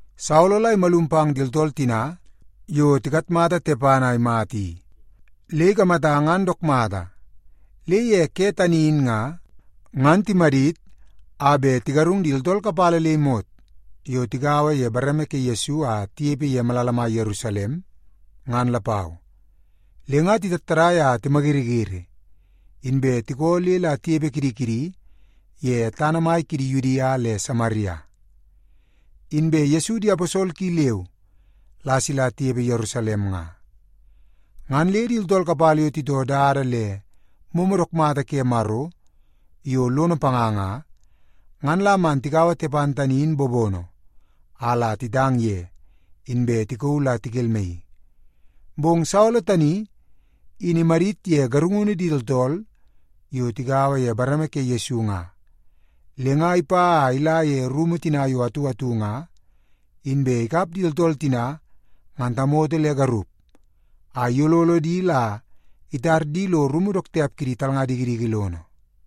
Saolo la imalum pang di tooltool tina yo tikatmata Tepan a imata i, le ikamata ngan dook mata. Le ye ke tani in nga, ngan timadit a bet tigarung di tooltool kapala le imot yo tigaua ye bareme ke Yesu a tinepe ye malala mai Yerusalem, ngan lapau. Le nga titattadai a timayiriyiri, inbe tikoo le la tinepe kidi kidi ye tana mai kidi Yudia le Samaria. Inbe Yesu di aposol ki leu la sila tinepe Yerusalem nga. Ngan le di tooltool kapala yo titoo dada le momo dook mata ke Maro yo lono panga nga, ngan la man tikaua Tepan tani in bobono a la titang ye, inbe tikauu la tikelmaii. Bong Saolo tani in imadit ye garungunu di tooltool yo tigaua ye bareme ke Yesu nga. Le nga ipa a ila ye rumu tina yo atu atu nga, inbe ikap di tooltool tina ngan tamoto le garup, a iyololo di la itar di lo rumu dook tiap kidi talnga dikidiki lono.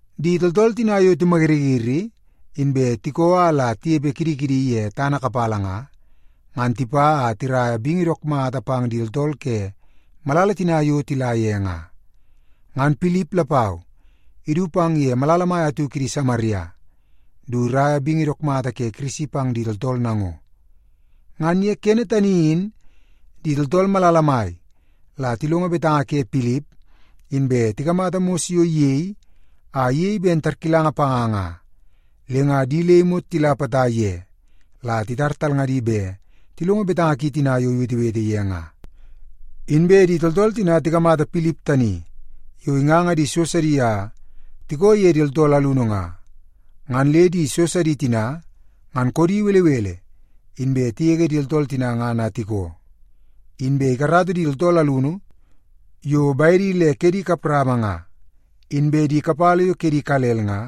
Di tooltool tina yo timayiriyiri inbe tikoo a la tinepe kidi kidi ye tana kapala nga, ngan tipa a tiraia bingi dook mata pang di tooltool ke malala tina yo tila ye nga. Ngan Pilip lapau idu pang ye malala mai atu kidi Samaria du iraia bingi dook mata ke Kirisi pang di tooltool nango. Ngan ye kene tani in, di tooltool malala mai la tilongo betanga ke Pilip, inbe tikamata mos yo iyei a iyei ben tarkilanga panga nga, le nga di le imot tila potai ye la titar talngadi bet tilongo betanga ki tina yo iwetewete ye nga. Inbe di tooltool tina tikamata Pilip tani yo inganga di so sidi a tikoo ye di tooltool alunu nga, ngan le di so sidi tina ngan koodi belebele, inbe tigege di tooltool tina ngan a tikoo. Inbe ikarata di tooltool alunu yo bedi le kedi kap rama nga, inbe di kapala yo kedi ikalel nga,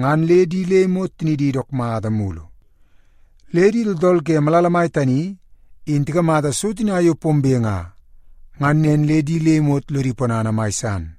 ngan le di le imot tinidi dook mata mulu. Le di tooltool ke malala mai tani in tikamata so tina yo pombe nga, ngan nen le di le imot lodi ponana mai san.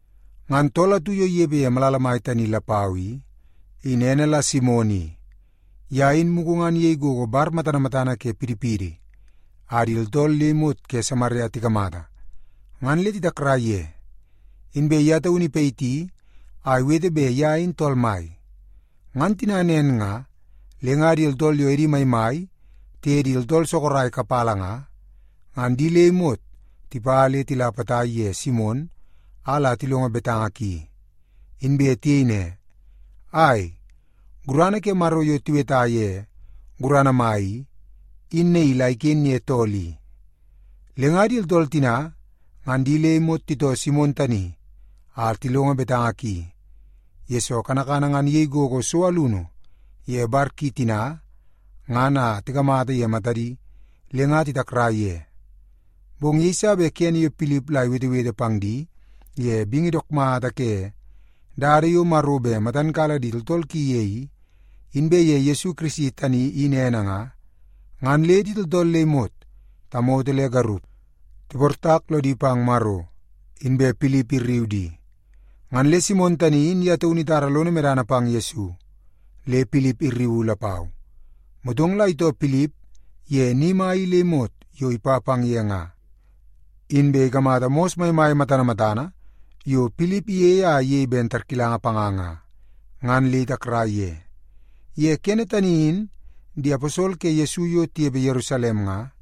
Ngan tool atu yo inepe ye malala mai tani lapau i, in ene la Simon i. Ye in mugu ngan iyei gogo bar matana matana ke pidipidi, a di tooltool le imot ke Samaria tikamata, ngan le titakrai ye. Inbe ye taunu ipayiti a iwete bet ye in tool mai. Ngan tina nen nga, le nga di tooltool yo edi maimai tiye di tooltool sorok kapala nga, ngan di le imot tipa le tila potai ye Simon a la tilongo betanga ki. Inbe tiyei ne, “Ai, gurana ke Maro yo tiweta ye Gurana Mai i, in naii la iken ye tool i.” Le nga di tooltool tina ngan di le imot titoo Simon tani a tilongo betanga ki, yesoo kanakana ngan iyei gogo so alunu ye bar ki tina ngan a tikamata ye matadi le nga titakrai ye. Bong yeiso bet kene yo Pilip la iwetewete pang di ye bingi dook mata ke dada yo Maro bet matan kala di tooltool ki ye i, inbe ye Yesu Kirisi tani in ene nga, ngan le di tooltool le imot, tamoto le garup, tiportak lodi pang Maro, inbe Pilip irriu di. Ngan le Simon tani in ye taunu itara lono medana pang Yesu, le Pilip irriu lapau. Motong la itoo Pilip ye ni mai i le imot yo ipa pang ye nga, inbe ikamata mos maimai matana matana yo Pilip iyei a iyei ben tarkilanga panga nga, ngan le itakrai ye. Ye kene tani in di aposol ke Yesu yo tinepe Yerusalem nga,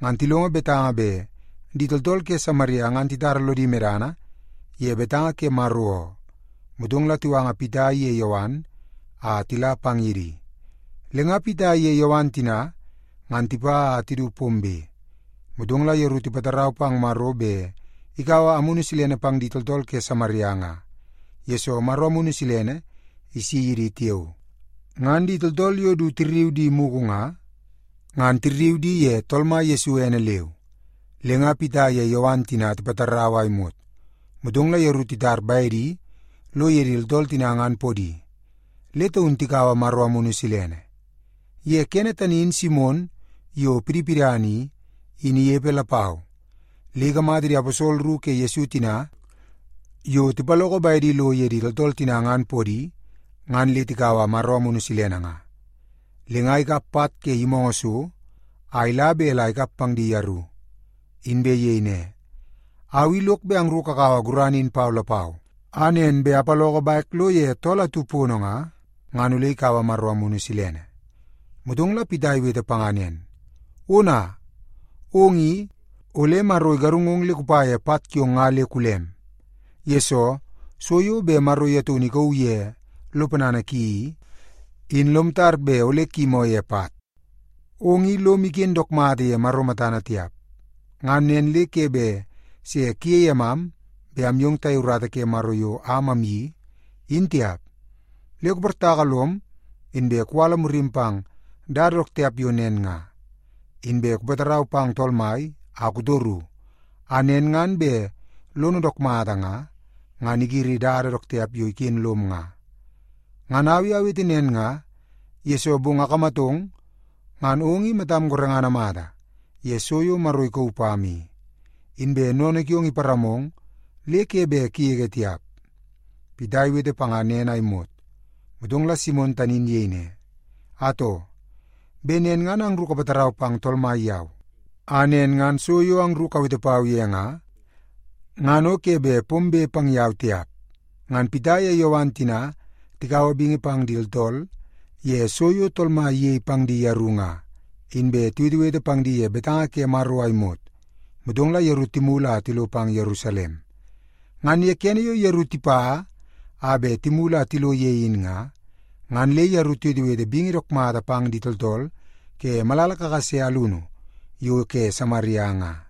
ngan tilongo betanga bet di tooltool ke Samaria ngan titara lodi medana ye betanga ke Maro oo. Motong la tiwanga Pita iye Yowan a tila pang ye di. Le nga Pita iye Yowan tina ngan tipa a du pombe, motong la yeru tipatarau pang Maro bet ikaua Amunu Silene pang di tooltool ke Samaria nga, yesoo Maro Amunu Silene isi ye di tiao. Ngan di tooltool yo du tirriu di mugu nga, ngan tirriu di ye Tool Mai Yesu ene leu. Le nga Pita iye Yowan tina tipatarau a imot, motong la yeru titar bedi lo ye di tooltool tina ngan podi, le taun tikaua Maro Amunu Silene. Ye kene tani in Simon, yo pidipidana i, in inepe lapau, le ikamata di aposol ru ke Yesu tina yo tipaloko bedi lo ye di tooltool tina ngan podi, ngan le tikaua Maro Amunu Silene nga. Le nga ikap pat ke yimoongoo so a ila bet la ikap pang di yeru, inbe iyei ne, “Au i lok bet angru kakaua gurana in pau lapau, a nen ngan bet apaloko bek lo ye tool atu pono nga, ngan ole ikaua Maro Amunu Silene.” Motong la Pita iwete panga nen, “Ona, ong i, ole Maro igarungong le kupa ye pat kiong nga le kulem, yesoo so yo bet Maro ye taunu ikauu ye lo ponana ki i, in lom tar bet ole kuyimoo ye pat. Ong i lom iken dook mata ye Maro matana tiap. Ngan nen le ke bet se kuyei emam bet amyong tayei urata ke Maro yo am amyeii, in tiap. Le kuportaka lom, inbe kuwala murim pang dada dook tiap yo nen nga. Inbe kupatarau pang Tool Mai a kutoru, a nen ngan bet lono dook mata nga, ngan igiri dada dook tiap yo iken lom nga. Ngan au i awete nen nga, yesoo bong akamatong, ngan ong i matam gorengana mata ye so yo Maro ikauu pam i, inbe sennene kiong iparamong le ke bet kugege tiap.” Pita iwete panga nen a imot, motong la Simon tani in iyei ne, “Atoo, bet nen ngan angru kapatarau pang Tool Mai yau, a nen ngan so yo angru kawete pau ye nga, ngan o ke bet pombe pang yau tiap.” Ngan Pita ye Yowan tina tikaua bingi pang di tooltool ye so yo Tool Mai iyei pang di yeru nga, inbe tiwetewete pang di ye betanga ke Maro a imot, motong la yeru timulu a tilo pang Yerusalem. Ngan ye kene yo yeru tipa a bet timulu a tilo ye in nga, ngan le yeru tiwetewete bingi dook mata pang di tooltool ke malala kakase alunu yo ke Samaria nga.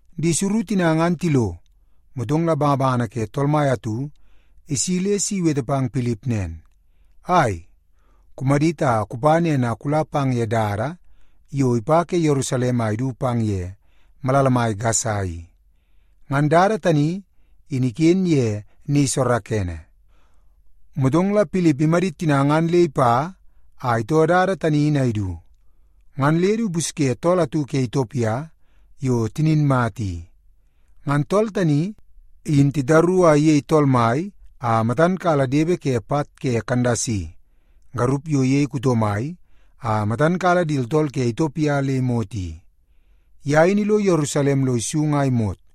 Di suru tina ngan tilo, motong la bangabangana ke Tool Mai atu isi le si iwete pang Pilip nen, “Ai, kumadit a kupa nen a kula pang ye dada yo ipa ke Yerusalem a idu pang ye malala mai Gasa i.” (Ngan dada tani in iken ye ni soorookoonoo.) Motong la Pilip imadit tina ngan le ipa a itoo dada tani in a idu, ngan le du ipusye tool atu ke Itiopia yo tinin mata i. Ngan tool tani in titaru a iyei tool mai a matan kala depe ke pat ke Kandasi, garup yo iyei kuto mai a matan kala di tooltool ke Itiopia le imot i. Ye in ilo Yerusalem lo isung a imot,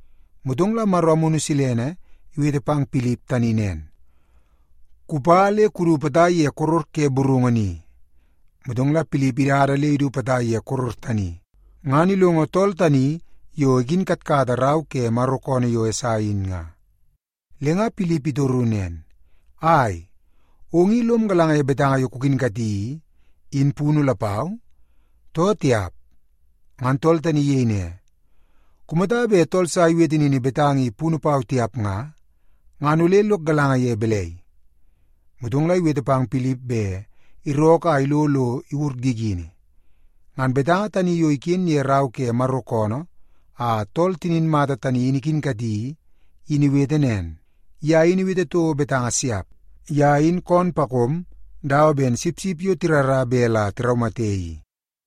Motong la Maro Amunu Silene iwete pang Pilip tani nen, “Kupa le kudu potai ye koror ke burungu ni.” Motong la Pilip idada le idu potai ye koror tani, ngan ilongo tool tani yo ikinkatkata rau ke Maro koonoo yo Esai in nga. Le nga Pilip itoru nen, “Ai, ong i lom galanga ye betanga yo kukinkati i, in punu lapau, too tiap?” Ngan tool tani iyei ne, “Kumata bet tool sa iwete nini betanga i punu pau tiap nga, ngan ole lok galanga ye balai?” Motong la iwete pang Pilip bet irookoo a ilo lo iwur gigini. Ngan betanga tani yo iken ye rau ke Maro koonoo a tool tinin mata tani in ikinkati i, in iwete nen: “Ye in iwete toko betanga siap. Ye in koom pakom dawa ben sipsip yo tirara bet la tiraumate i,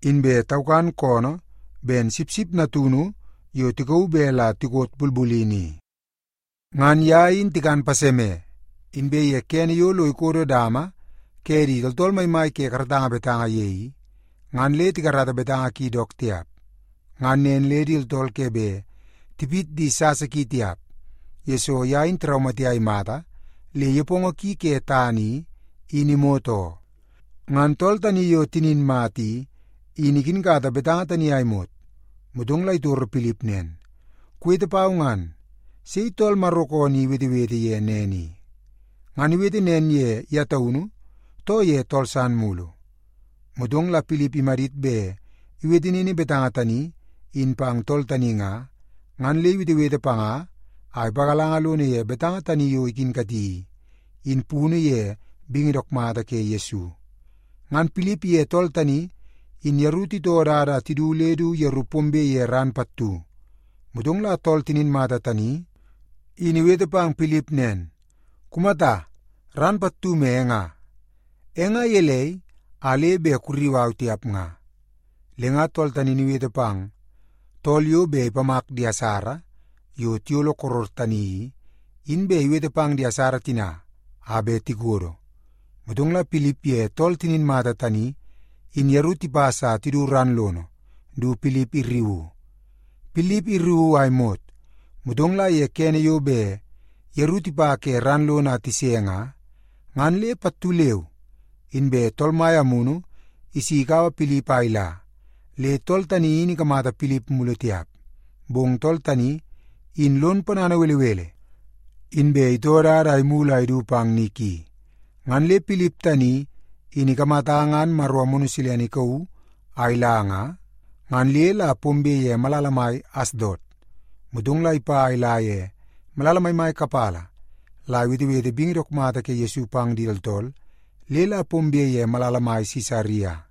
inbe taukan koonoo ben sipsip natunu yo tikauu bet la tikot bulbulini i. Ngan ye in tikan paseme, inbe ye kene yo lo ikodo dama ke di tooltool maimai ke karatanga betanga ye i, ngan le tikarata betanga ki dook tiap. Ngan nen le di tooltool ke bet tipit di sasa ki tiap, yesoo ye in tiraumate a imata le nepongo ki ke tana i, in imot oo.” Ngan tool tani yo tinin mata i, in ikinkata betanga tani a imot, motong la itoro Pilip nen, “Kuwete pau ngan, sei tool Maro koonoo i iwetewete ye nen i? Ngan iwete nen ye ye taunu, too ye tool san mulu?” Motong la Pilip imadit bet iwete nini betanga tani in pang tool tani nga, ngan le iwetewete panga a ipagalanga lono ye betanga tani yo ikinkati i, in punu ye bingi dook mata ke Yesu. Ngan Pilip iye tool tani in yeru titoo dada a tidu le la yeru pombe ye ran pattu. Motong la tool tinin mata tani in iwete pang Pilip nen, “Kumata, ran pattu me e nga. E nga gelei a le bet kurriu au tiap nga?” Le nga tool tani in iwete pang tool yo bet ipamak di asara yo tiyolo koror tani i, in bet iwete pang di asara tina a bet tikodo. Motong la Pilip ye tool tinin mata tani in yeru tipas a tidu ran lono du Pilip irriuu. Pilip irriuu a imot, motong la ye kene yo bet yeru tipa ke ran lono a tise nga, ngan le pattu leu inbe Tool Mai Amunu isi ikaua Pilip a ila, le tool tani in ikamata Pilip mulu tiap. Bong tool tani, in lon ponana belebele, inbe itoo dada a imulu a idu pang ni ki. Ngan le Pilip tani in ikamata ngan Maro Amunu Silene ikauu a ila nga, ngan le la pombe ye malala mai Asdot. Motong la ipa a ila ye malala maimai kapala la iwetewete bingi dook mata ke Yesu pang di tooltool le la pombe ye malala mai Sisaria.